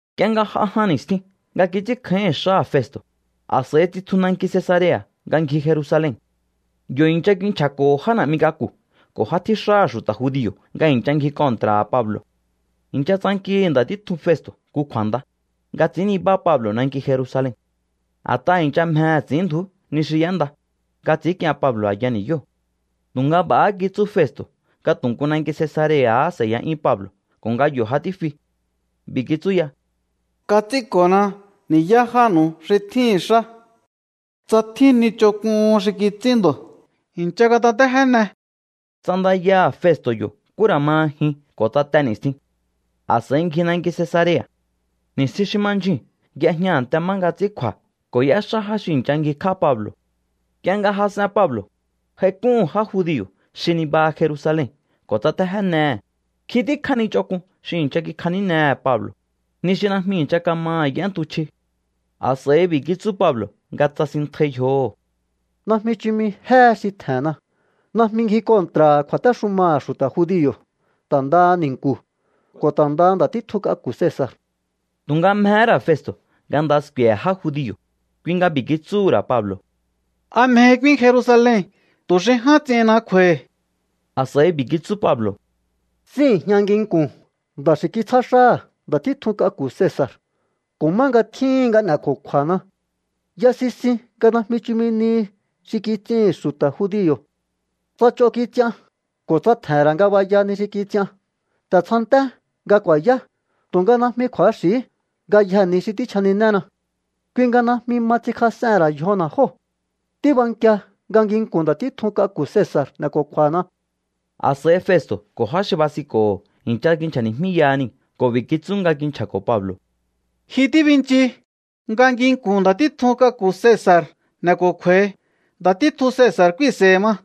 Nk'ie nga j'a jan ni̱stjin nga kits'ínkjáíhi̱n xáha̱ Festo̱, a̱s'a̱i tsitju nanki Cesarea̱ nga ngji Jerusalen. Yo̱ i̱ncha kinchja̱ko̱ho̱ já na̱'mi k'aku̱ ko̱ já tjíxáha̱ xu̱ta̱ judio̱ nga i̱ncha ngji kontra̱ha̱ Pablo̱. I̱ncha tsankihi̱ nda̱ títjun Festo̱ nku kju̱a̱nda, nga ts'i̱ín nibá Pablo̱ nanki Jerusalen. A̱t'aha̱ i̱ncha mjehe̱ ts'i̱ínndju̱ú ni xi y'énda, nga ts'i̱ínk'ien Pablo̱ a̱ya ni̱yóo̱. Tu̱nga b'a̱há kitsú Festo̱ nga tu̱ nku nanki Cesarea̱há s'e̱ya'yún Pablo̱ ko̱ nga yo̱ ja tífi. B'i̱ kitsú ya: —Kats'ínko̱na ni̱yá jánu̱u xi tjíhi̱n xá. Tsa tjín ni ch'onk'uhun xi kits'ín ndo̱, i̱ncha katatéjéne. Ts'andayaha̱ Festo̱ yo̱ nkú ra̱ ma jin ko̱ tsa te ni̱stjin. A̱s'a̱i ngji nanki Cesarea̱. Ni̱stjin xi ma ndyjuu̱n y'ejña a̱nte má nga ts'ín kju̱a̱ ko̱ y'éxá já xi i̱ncha ngjikj'á Pablo̱. Nk'ie nga jas'en Pablo̱, j'aik'úhu̱n já judio̱ xi nibaha Jerusalen ko̱ tsatéjénehe̱. Nkjin tíkjá ni ch'onk'un xi i̱ncha kikjanínehe̱ Pablo̱, ni xi najmi i̱ncha kamaha̱ y'éntuchji. A̱s'a̱i b'i̱ kitsú Pablo̱ nga tsasinntjai yjoho̱: —Najmi chumi jéhe xi tje̱nna. Najmi ngji kontra̱ha̱ kju̱a̱téxumaha̱ xu̱ta̱ judio̱, ta̱ ndaha ni̱nku̱, ko̱ ta̱ ndaha nda̱ títjun k'aku̱ Cesa̱r. Tu̱nga mjehé ra̱ Festo̱ nga nda sku̱e̱he̱ já judio̱, kui nga b'i̱ kitsúhu̱ ra̱ Pablo̱: —¿A mjehi k'úín Jerusalen tu̱ xi ján ts'ihinna kju̱a̱hi̱? A̱s'a̱i b'i̱ kitsú Pablo̱: —Síi̱jña nginku̱n nda̱ xi kitsjá xáha̱ nda̱ títjun k'aku̱ Cesa̱r ko̱ má nga tjíhin nga n'e̱ko̱kju̱a̱na. Ya sisin nga najmi chumi nihi xi kits'ihi̱n xu̱ta̱ judio̱. Tsa ch'on kits'ian ko̱ tsa tje̱he̱n ra̱ ngabaya ni xi kits'ian, ta̱ tsjanté nga ku̱a̱yá. Tu̱nga najmi kju̱axi̱hí ngayjee̱ ni xi tíchjaninéna. Kui nga najmi ma ts'inkjas'ehe̱n ra̱ yjona̱ jóo̱. Tíbankia nga nginku̱n nda̱ títjun k'aku̱ Cesa̱r n'e̱ko̱kju̱a̱na̱. A̱s'a̱i Festo̱ ko̱ já xi basinko̱ho̱ i̱ncha kinchja̱ni̱jmíyaha niu̱ ko̱ b'i̱ kitsú nga kinchja̱ko̱ Pablo̱: —Ji tíbinchi nga nginku̱n nda̱ títjun k'aku̱ Cesa̱r n'e̱ko̱kju̱a̱hi. Nda̱ títjun Cesa̱r k'úínse̱i̱hi̱ ma.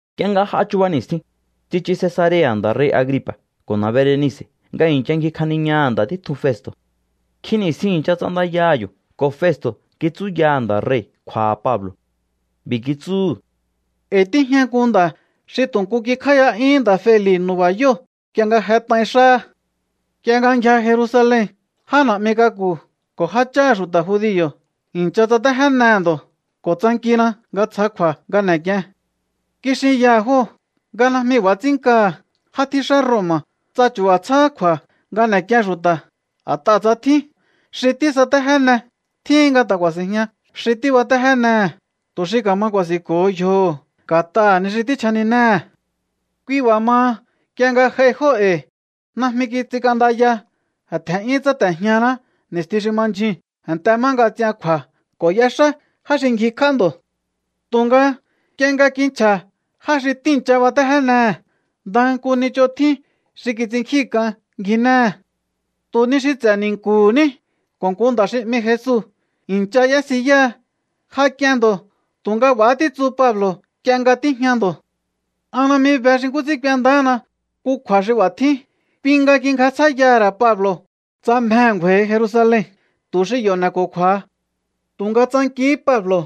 Nk'ie nga j'a chuba ni̱stjin, tsichu Cesarea̱ nda̱ rei̱ Agripa̱ ko̱ na̱ Berenice̱ nga i̱ncha ngjikjaniñaha̱ nda̱ títjun Festo̱. Nkjin ni̱stjin i̱ncha ts'andayaha̱ yo̱ ko̱ Festo̱ kitsúyaha̱ nda̱ rei̱ kju̱a̱ha̱ Pablo̱. B'i̱ kitsúhu̱: —E̱i̱ tíjña nku nda̱ xi tu̱ nku kikj'áíya'yúhún nda̱ Feli̱ nu̱ba̱yóo̱ nk'ie nga jet'ain xáha̱. Nk'ie nga ngjia Jerusalen, já na̱'mi k'aku̱ ko̱ jácháha̱ xu̱ta̱ judio̱ i̱ncha tsatéjénehe̱ ndo̱ ko̱ tsankina nga tsja kju̱a̱ nga n'e̱k'ien. Kixinyaha̱ jóo̱ nga najmi b'a̱ ts'ín nkaha̱ já tjíxá Roma̱, tsa chu̱ba̱ tsjáhá kju̱a̱ nga n'e̱k'ien xu̱ta̱. A̱t'aha̱ tsa tjín xi tísatéjéne, tjíhin nga ta̱ ku̱a̱si̱njña xi tíbatéjénehe̱ tu̱ xi ka̱ma ku̱a̱si̱nko̱ho yjoho̱ nga̱t'aha̱ ni xi tíchjaninéhe̱. ’Kui b'a̱ maha, nk'ie nga j'aihi jóo̱ e̱i̱, najmi kits'ink'andaya. Tje̱n'yún tsáte̱jñaná ni̱stjin xi ma ndyjuu̱n a̱nte má nga ts'ian kju̱a̱ ko̱ y'exá já xi ngjikj'á ndo̱. Tu̱nga nk'ie nga kinchja̱ já xi tíi̱ncha batéjénehe̱, ndaha nku ni ch'on tjín xi kits'innkjíhi̱n k'an ngjinéhe̱. Tu̱ ni xi ts'e̱ ni̱nku̱hu̱ ní ko̱ nku nda̱ xi 'mi Jesu i̱ncha y'ésiyáha. Ja k'ien ndo̱, tu̱nga b'a̱há títsu Pablo̱ nk'ie nga tíjña ndo̱. ’An najmi be xi nkú ts'ín k'uendáhana nku kju̱a̱ xi b'a̱ tjín. Kui nga kingjasjáíyaha̱ ra̱ Pablo̱ tsa mjehe̱ ngju̱a̱i̱hi Jerusalen tu̱ xi yo̱ n'e̱ko̱kju̱a̱ha. Tu̱nga tsankihí Pablo̱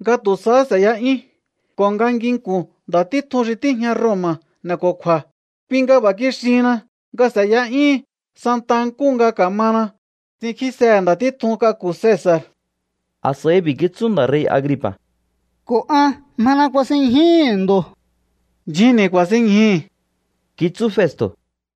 nga tu̱ sahá s'e̱ya'yún ko̱ nga nginku̱n nda̱ títjun xi tíjña Roma̱ n'e̱ko̱kju̱a̱. Kui nga b'a̱ kixihinna nga s'e̱ya'yúhun santa nkúhu nga ka̱mana ts'inkjísehe̱ nda̱ títjun k'aku̱ Cesa̱r. A̱s'a̱i b'i̱ kitsú nda̱ rei̱ Agripa̱: —Ko̱ an mjena kuasinñjúhu̱ ndo̱. —Ndyjunni̱ ku̱a̱sinñjúhi̱ —kitsú Festo̱.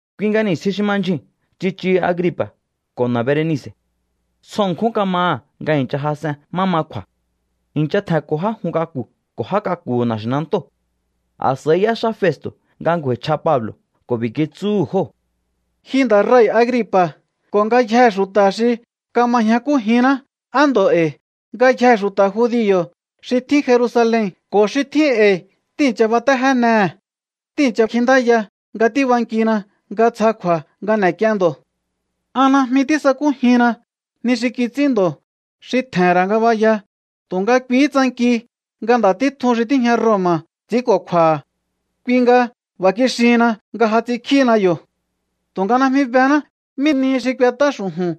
Kui nga ni̱stjin xi ma ndyjuu̱n tsichuhu Agripa̱ ko̱ na̱ Berenice̱. Tsjo ṉkjún kama nga i̱ncha jas'en má ma kju̱a̱. I̱ncha tje̱nko̱ já jun k'aku̱ ko̱ já k'aku̱hu̱ na̱xi̱nantóo̱. A̱s'a̱i y'éxá Festo̱ nga ngju̱a̱i̱chj'a Pablo̱ ko̱ b'i̱ kitsúhu̱ jóo̱: —Ji nda̱ rei̱ Agripa̱ ko̱ ngayjee̱ xu̱ta̱ xi kama ñjakújinná, á ndo̱ e̱i̱. Ngayjee̱ xu̱ta̱ judio̱ xi tjín Jerusalen ko̱ xi tjín e̱i̱ tíi̱ncha batéjénehe̱. Tíi̱ncha kjintáya nga tíbankina nga tsja kju̱a̱ nga n'e̱k'ien ndo̱. An najmi tísakújinna ni xi kits'ín ndo̱ xi tje̱he̱n ra̱ ngabaya. Tu̱nga kuihí tsanki nga nda̱ títjun xi tíjña Roma̱ ts'i̱ínko̱kju̱a̱ha̱. Kui nga b'a̱ kixihinna nga ja ts'inkjíhina yo̱. ’Tu̱nga najmi bená mí nihi xi k'uet'á xu̱ju̱n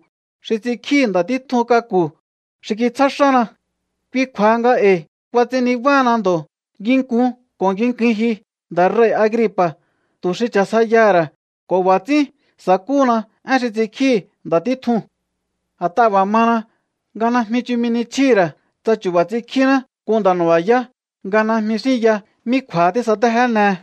xi ts'inkjíhi̱ nda̱ títjun k'aku̱ xi kitsjá xána. Kui kju̱a̱ha nga e̱i̱ kuats'in nibáhana ndo̱ nginkun ko̱ ngikuin ji, nda̱ rei̱ Agripa̱, tu̱ xi cha̱sjaiyaha̱ ra̱á ko̱ b'a̱ ts'ín sa̱kúhuna én xi ts'inkjíhi̱ nda̱ títjuu̱n. A̱t'aha̱ b'a̱ mana nga najmi chumi ni chjíhi̱ ra̱ tsa chu̱ba̱ ts'inkjíná nku nda̱ nu̱ba̱yá nga najmi xínya mí kju̱a̱ha tísatéjénehe.